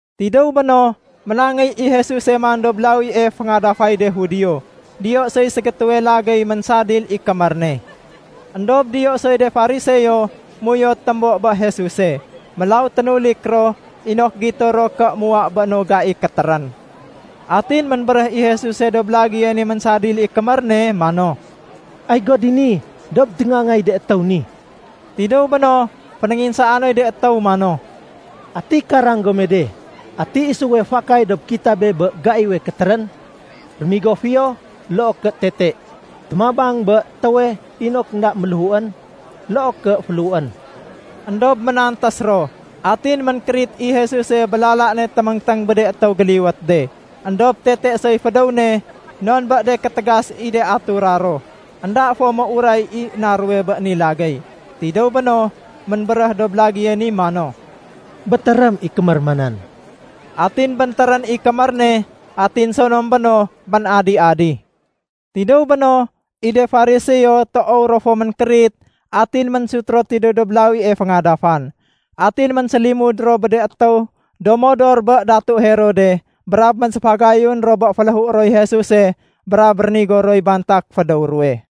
Tidéw béno, ménangéy i Jesuse man dob lawie féngadafay de Judio. Diyo soy ségétéwe lagéy ménsadil i kémér ne. Endob diyo soy de Fariseo méuyot témbo bé Jesuse. Mélaw ténulik ro, inok gito ro ké muwa bé no gai kétérén. Atin ménbéréh i Jesuse dob lagéye ni ménsadil i kémér ne mano, “Ay go dini dob téngaangay de étéw ni.” Tidéw béno, fénénginsaa noy de étéw mano, “Ati karang gome de, ati isuwe fakay dob kitabe bé gaiwe kétérén? Rémigo fiyo, loo ké tete? Témabang bé étéwe inok énda méléhuén, loo ké féléhuén?” Endob ménantés ro. Atin ménkérit i Jesuse bé lala ne téméngténg bé de étéw géliwét de. Endob tete soy fédéw ne non bé de kétégas i de atura ro énda fo méuray i na ruwe bé ni lagéy. Tidéw béno, ménbéréh dob lagéye ni mano, “Bétérém i kémér ma nan.” Atin béntérén i kémér ne atin sonom béno, ménadi-adi. Tidéw béno, i de Fariseo toow ro fo ménkérit atin ménsut ro tidéw dob lawie féngadafan. Atin ménsélimud ro bé de étéw do modor bé Datu Herode brab ménséfagayun ro bé féléhué roy Jesuse brab rénigo roy bantak fédéw ruwe.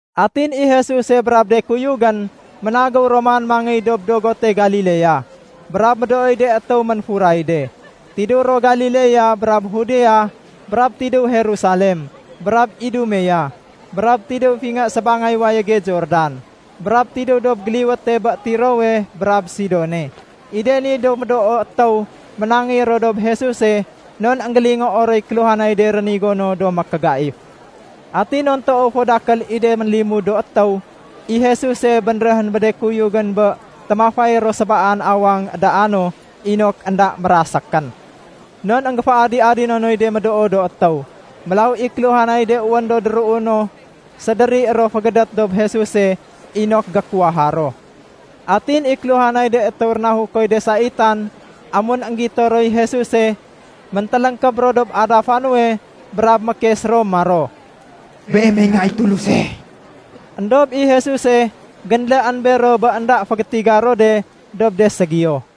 Atin i Jesuse brab de kuyugén ménagéw ro man mangéy dob dogote Galilea, brab médooy de étéw ménfuray de. Tidéw ro Galilea brab Judea, brab tidéw Jerusalem, brab Idumea, brab tidéw fingé sébangay wayége Jordan, brab tidéw dob géliwéte bé Tirowe brab Sidone. I de ni do médoo étéw ménangéy ro dob Jesuse non énggélingoo roy kéluhanay de rénigo no do mékégaif. Atin non toow fo dakél i de ménlimud do étéw, i Jesuse bénréhén bé de kuyugén bé témafay ro sébaan awang édaa no inok énda mérasékén. Non énggéféadi-adino noy de médoo do étéw. Mélaw i kéluhanay de wén do déruuno sédéri ro fégédét dob Jesuse inok gékuwaha ro. Atin i kéluhanay de étéw rénahukoy de saitan, amun énggito roy Jesuse, méntéléngkéb ro dob adafa nuwe brab mékes ro maro, “Beemey Nga i Tuluse.” Endob i Jesuse génléén bero bé énda fégétiga ro de dob de ségiyo.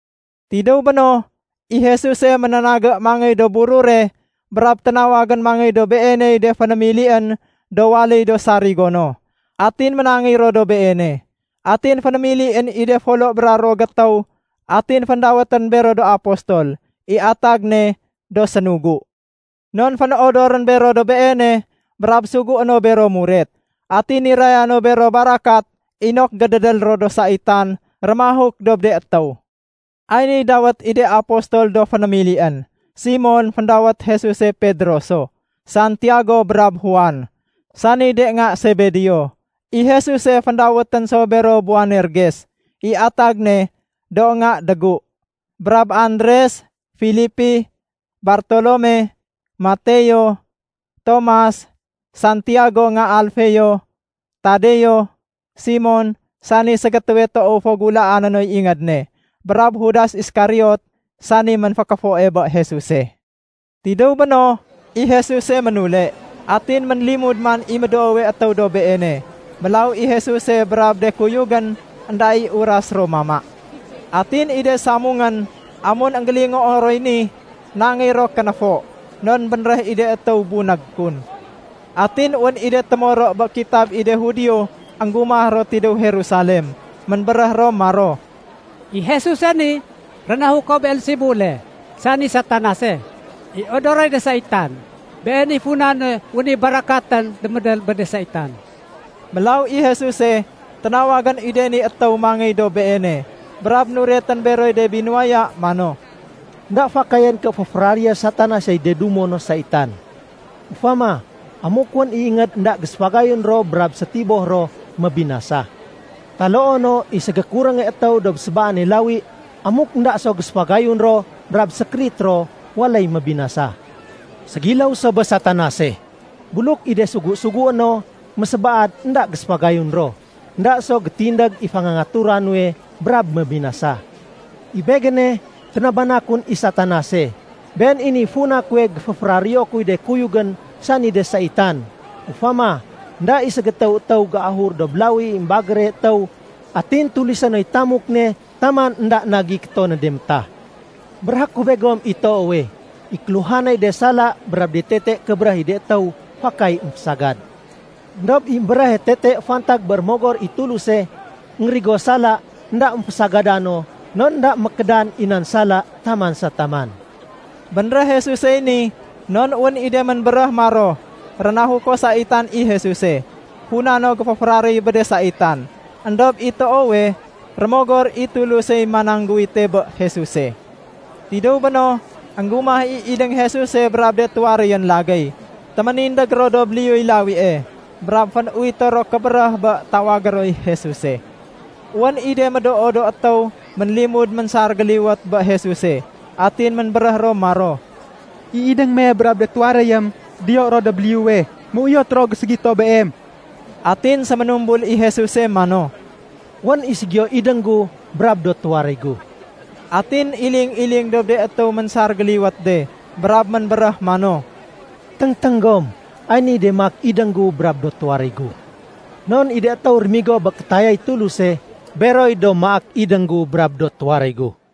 Tidéw béno, i Jesuse ménénagé mangéy dob burure brab ténawagén mangéy dob Beeney de fénémilién do waléy do sarigo no. Atin ménangéy ro dob Beene. Atin fénémilién i de folo bra ruwo gétéw, atin féndawétén bero do apostol (i atag ne “do sénugu”). Non fénodorén bero dob Beene, brab sugué no bero muret. Atin niraya no bero barakat inok gédédél ro do saitan rémahuk dob de étéw. Ay niy de dawét i de apostol do fénémilién: Simon (féndawét Jesuse Pedro so), Santiago brab Juan, sani de nga Sebedeo. I Jesuse féndawétén so bero Boanerges (i atag ne “do nga dégu”), brab Andres, Filipi, Bartolome, Mateo, Tomas, Santiago nga Alfeo, Tadeo, Simon sani ségétéwe toow fo gulaané noy ingéd ne, brab Judas Iskariot, sani ménfékéfoe bé Jesuse. Tidéw béno, i Jesuse ménule. Atin ménlimud man i médoowe étéw dob Beene. Mélaw i Jesuse brab de kuyugén, énda i uras ro mama. Atin i de samungén, amun énggélingoo roy ni, nangéy ro kénéfo, non bénréh i de étéw bunég kun. Atin wén i de témoro bé kitab i de Judio énggumah ro tidéw Jerusalem. Ménbéréh ro maro, “I Jesuse ni rénahuko Beelsebule, sani Satanase, i odoroy de saitan. Been i funa nuwe wén i barakatén démédél bé de saitan.” Mélaw i Jesuse ténawagén i de ni étéw mangéy dob Beene, brab nuretén beroy de binuwaya mano, “Enda fakayén ké féféraréyé Satanasey de dumo no saitan. Ufama, amuk wén i ingéd énda géséfagayun ro brab sétiboh ro, mébinasa. Taloo no i ségékurénge étéw dob sébaane lawi amuk énda so géséfagayun ro brab sékérit ro, waléy mébinasa. Ségiléw so bé Satanase. Buluk i de sugu-sugué no mésébaad énda géséfagayun ro, énda so gétindég i fangangatura nuwe, brab mébinasa. “I Begéne, ténabana kun i Satanase. Been i niy funa kuwe géféféraréyo kuy de kuyugén sani de saitan. Ufama, énda i ségétéw étéw géahur dob lawi i émbagére étéw atin tulisé noy tamuk ne taman énda na géikéto no de métah. “Béréhé ku begom i toowe, i kéluhanay de sala brab de tete kébéréh i de étéw fakay émfésagad. Endob i émbéréhe tete fantag bé Rémogor i Tuluse énggérigo sala énda émfésagada no non énda mékédan i nan sala taman sa taman.” Bénréh Jesusey ni non wén i de ménbéréh maro, “Rénahuko saitan i Jesuse, funa no géféféraréy bé de saitan.” Endob i toowe, Rémogor i Tulusey manangguwite bé Jesuse. Tidéw béno, énggumah i idéng Jesuse brab de tuwaréyén lagéy. Téménindég ro dob liyuy lawie, brab fén-uwito ro kébéréh bé tawagé roy Jesuse. Wén i de médoo do étéw ménlimud ménsar géliwét bé Jesuse, atin ménbéréh ro maro, “I idéng me brab de tuwaréyém diyo ro dob liyuwe. Méuyot ro géségito Beem.” Atin séménumbul i Jesuse mano, “Wén i ségiyo idéng gu brab do tuwaréy gu.” Atin iling-iling dob de étéw ménsar géliwét de brab ménbéréh mano, “Téngténg gom, ay niy de maak idéng gu brab do tuwaréy gu. Non i de étéw rémigo bé kétayay Tuluse, beroy do maak idéng gu brab do tuwaréy gu.”